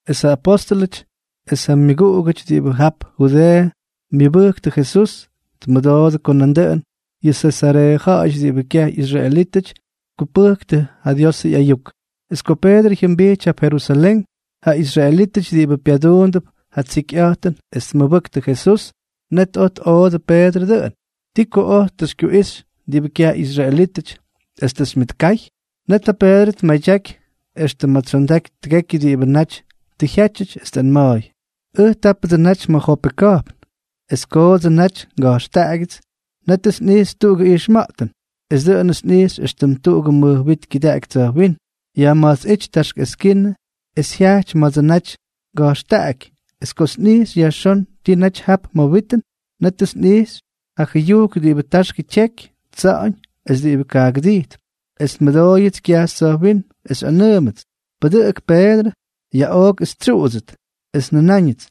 Es ja apóstʉlʉty es ja myʉguꞌugʉty diꞌibʉ jap Judeeʉ myʉbʉjktʉ Jesús, tmʉdoodʉ ko nandʉꞌʉn yʉ Sesareeʉ ja̱ꞌa̱yʉty diꞌibʉ kyaj ꞌyisraelítʉty tkupʉjktʉ Diosʉ ꞌyayuk. Es ko Peedrʉ jyʉmbijty jap Jerusalén, ja israelítʉty diꞌibʉ pyaduundʉp ja tsikyꞌa̱jtʉn es tmʉbʉktʉ Jesús, net oj tꞌoodʉ Peedrʉ dʉꞌʉn: —¿Ti ko oj tʉ xykyuꞌixy diꞌibʉ kyaj ꞌyisraelítʉty, es tʉ xymyʉtkay? Net ja Peedrʉ tmadyaky extʉ ma̱ tsyondaky tʉgekyʉ diꞌibʉ naty tʉ jyátyʉty, es tꞌanma̱a̱y: —Ʉj tápʉdsʉ naty ma̱ Jope ka̱jpn. Es kodsʉ naty nga̱jxtaꞌaky, nétʉts nꞌijxy tuꞌugʉ ijxma̱ꞌtʉn. Es dʉꞌʉnʉts nꞌijxy éxtʉm tuꞌugʉ mʉj wit kyʉdaꞌaky tsa̱jwínm, yajma̱jtsꞌíty taxk eskinʉ es jyajty ma̱dsʉ naty nga̱jxtaꞌaky. Es kots nꞌijxy yajxón ti naty jap ma̱ witʉn, nétʉts nꞌijxy ja jʉyujk diꞌibʉ taxkʉ tyeky, tsa̱ꞌa̱ñ es diꞌibʉ kaagʉdijtp. Es nmʉdooyʉts kyajxy tsa̱jwínm, es xyꞌanʉʉmʉts: “Pʉdʉꞌʉk, Peedrʉ. Yaꞌook es xytsyuꞌudsʉt.” Es njʉnáñʉts: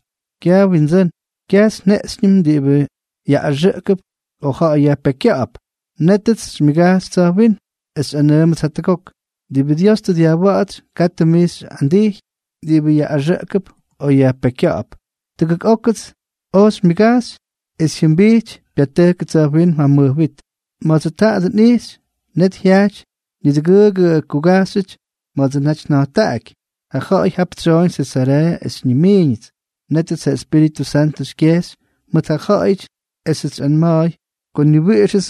“Kyaj Windsʉ́n. Kyajts njeꞌxyñʉm diꞌibʉ yaꞌꞌaxʉꞌkʉp o ja̱ꞌa̱y yajpekykya̱ꞌa̱p.” Nétʉts xymyʉgajxy tsa̱jwínm, es xyꞌanʉʉmʉts jatʉgok: “Diꞌibʉ Dios tʉ dyajwa̱ꞌa̱tsy, katʉ mij xyꞌandíjʉt diꞌibʉ yaꞌꞌaxʉꞌkʉp o yajpekykya̱ꞌa̱p.” Tʉgʉk ókʉts oj xymyʉgajxy, es jyʉmbijty pyatʉjkʉ tsa̱jwínm ja mʉj wit. Ma̱dsʉ taadʉ nꞌijxy, net jyajty nidʉgʉʉgʉ kugajxyʉty ma̱dsʉ naty nja̱jttaꞌaky. Ja ja̱ꞌa̱y jap tsyoꞌoñ Sesareeʉ es xyñimiiñʉts. Nétʉts ja Espíritʉ Santʉ xykyejxy mʉt ja ja̱ꞌa̱yʉty esʉts xyꞌanma̱a̱y ko ni wiꞌixʉts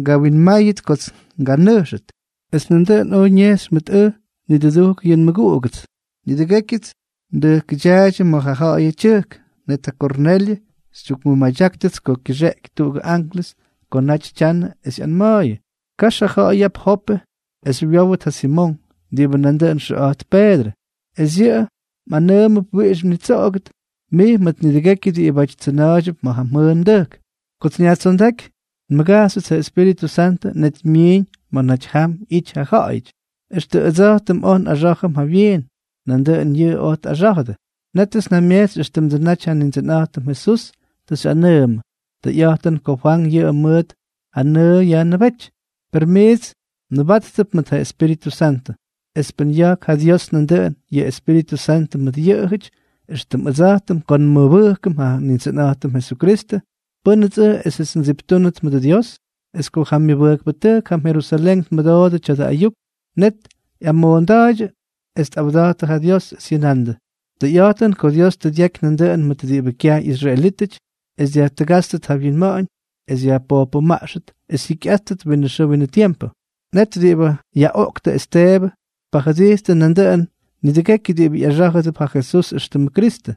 ngawinmáyʉt kots nganʉjxʉt. Es nandʉꞌʉn oj ñejxy mʉt ʉj nidʉdujk yʉ nmʉguꞌugʉts. Nidʉgékyʉts ndʉjkʉdyaaydyʉ ma̱ ja ja̱ꞌa̱yʉ tyʉjk. Net ja Kornelyʉ xytyukmʉmadyákʉts ko kyʉxeꞌky tuꞌugʉ anklʉs ko ta naty tyanʉ es ꞌyanma̱a̱yʉ: “Kax ja ja̱ꞌa̱y jap Jope es xywyówʉt ja Simonk, diꞌibʉ nandʉꞌʉn xyʉꞌa̱jtp Peedrʉ, es yʉꞌʉ mꞌanʉʉmʉdʉp wiꞌix mnitsoꞌogʉt, mij mʉt nidʉgekyʉ diꞌibáty tsyʉna̱a̱ydyʉp ma̱ ja mjʉʉn mdʉjk.” ’Kots nyajtsondáky nmʉgajxyʉts, ja Espíritʉ Santʉ net myiiñ ma̱ naty jam ꞌyity ja ja̱ꞌa̱yʉty. Extʉ ʉdsa̱jtʉm oj nꞌaxá̱jʉm jawyiin, nandʉꞌʉn yʉꞌʉ oj tꞌaxá̱jʉdʉ. Nétʉts njamyejtsy éxtʉmdsʉ naty yʉ Nindsʉnꞌa̱jtʉm Jesús tʉ xyꞌanʉʉmʉ: “Tʉyꞌa̱jtʉn ko Fwank yʉꞌʉ mʉt ja nʉʉ yajnʉbejty, per miits mnʉbáttʉt mʉt ja Espíritʉ Santʉ.” Es pʉn ya̱jk ja Dios nandʉꞌʉn yʉ Espíritʉ Santʉ mʉt yʉꞌʉjʉty, éxtʉm ʉdsa̱jtʉm ko nmʉbʉjkʉm ja Nindsʉnꞌa̱jtʉm Jesukristʉ, ¿pʉ́nʉts ʉj esʉts ndsiptúnʉt mʉdʉ Dios? Es ko ja myʉguꞌuktʉjk jam Jerusalén tmʉdoodʉ tya̱dʉ ayuk, net ꞌyamoonda̱a̱ydyʉ es tꞌawda̱jttʉ ja Dios, es jyʉnandʉ: —Tʉyꞌa̱jtʉn ko Dios tʉ dyaky nandʉꞌʉn mʉt diꞌibʉ kyaj ꞌyisraelítʉty es dyajtʉgátstʉt ja wyinma̱ꞌa̱ñ es yajpojpʉmaꞌxʉt es jyikyꞌáttʉt winʉ xʉʉ winʉ tiempʉ. Net diꞌibʉ yaꞌoꞌktʉ Esteebʉ tpajʉdijttʉ nandʉꞌʉn nidʉgekyʉ diꞌibʉ ꞌyaxá̱jʉdʉp ja Jesús éxtʉmʉ Kristʉ.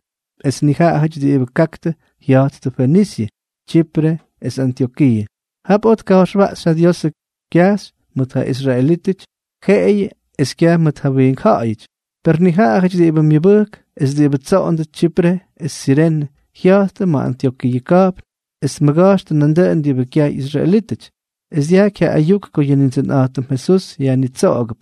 Es nijaꞌajʉty diꞌibʉ kaktʉ jya̱jttʉ Fenisyʉ, Tsyipre es Antyokiiʉ. Jap oj tka̱jxwaꞌxy ja Diosʉ kyajxy mʉt ja israelítʉty jeꞌeyʉ es kyaj mʉt ja wiink ja̱ꞌa̱yʉty. Per nijaꞌajʉty diꞌibʉ myʉbʉjk es diꞌibʉ tsoꞌondʉ Tsyipre es Sirene, jya̱jttʉ ma̱ Antyokiiʉ ka̱jpn es tmʉga̱jxtʉ nandʉꞌʉn diꞌibʉ kyaj ꞌyisraelítʉty, es dyajky ja ayuk ko yʉ Nindsʉnꞌa̱jtʉm Jesús yajnitsoꞌogʉdʉp.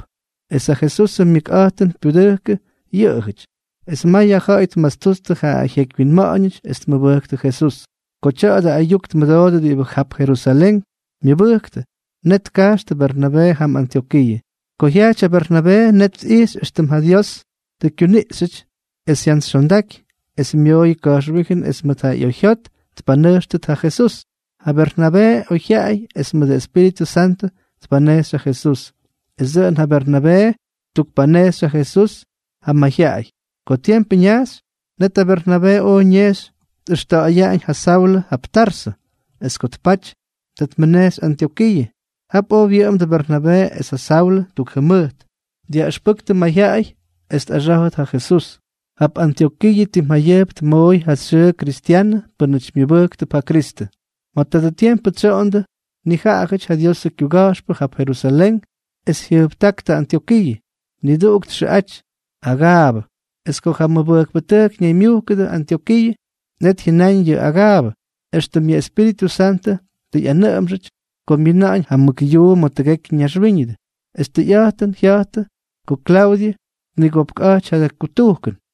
Es ja Jesusʉ myʉkꞌa̱jtʉn pyudʉjkʉ yʉꞌʉjʉty. Es may ja ja̱ꞌa̱y tmastuttʉ ja jyekywyinma̱ꞌa̱ñʉty es tmʉbʉjktʉ Jesús. Ko tya̱dʉ ayuk tmʉdoodʉ diꞌibʉ jap Jerusalén myʉbʉjktʉ, net tkajxtʉ Bernabee jam Antyokiiʉ. Ko jyajty ja Bernabee, net tꞌijxy éxtʉm ja Dios tʉ kyuniꞌxyʉty, es jyantsyxyondaky es myooyʉ ka̱jxwíjʉn es mʉt ja ꞌyoyjyot tpanʉjxtʉt ja Jesús. Ja Bernabee oyjyaꞌay es mʉʉdʉ Espíritʉ Santʉ, tpanejxy ja Jesús. Es dʉꞌʉn ja Bernabee ttukpanejxy ja Jesús ja mayjyaꞌay. Ko tiempʉ ñaxy, net ja Bernabee oj ñejxy tꞌʉxta̱ꞌa̱yaꞌañ ja Saulʉ jap Tarsʉ. Es ko tpaty, ta tmʉnejxy Antyokiiʉ. Jap oj wyʉꞌʉmdʉ Bernabee es ja Saulʉ tuk jʉmʉjt, dyaꞌʉxpʉjktʉ mayjyaꞌay es tꞌaxá̱jʉt ja Jesús. Jap Antyokiiʉ tim jayʉjp tmooy ja xyʉʉ kristyanʉ pʉ́nʉty myʉbʉjktʉp ja Kristʉ. Ma̱ tadʉ tiempʉ tsyoꞌondʉ nijaꞌajʉty ja Diosʉ kyuga̱jxpʉ jap Jerusalén es jyʉjptáktʉ Antyokiiʉ. Niduꞌuk txʉꞌaty Agaabʉ. Es ko ja mʉbʉjkpʉtʉjk ñaymyujkʉdʉ Antyokiiʉ, net jyʉnáñ yʉ Agaabʉ, éxtʉm yʉ Espíritʉ Santʉ tʉ ꞌyanʉꞌʉmxʉty, ko myina̱ꞌa̱ñ ja mʉk yuu ma̱ tʉgekyʉ naxwíñʉdʉ. Es tʉyꞌa̱jtʉn jya̱jtʉ ko Klaudyʉ tnigopkꞌa̱jty ja kutujkʉn.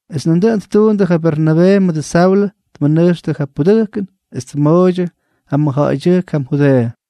Es dʉꞌʉn ttuundʉ, ja Bernabee mʉdʉ Saulʉ tmʉnʉjxtʉ ja pudʉjkʉn, es tmooydyʉ ja mʉjja̱ꞌa̱ydyʉjk jam Judeeʉ.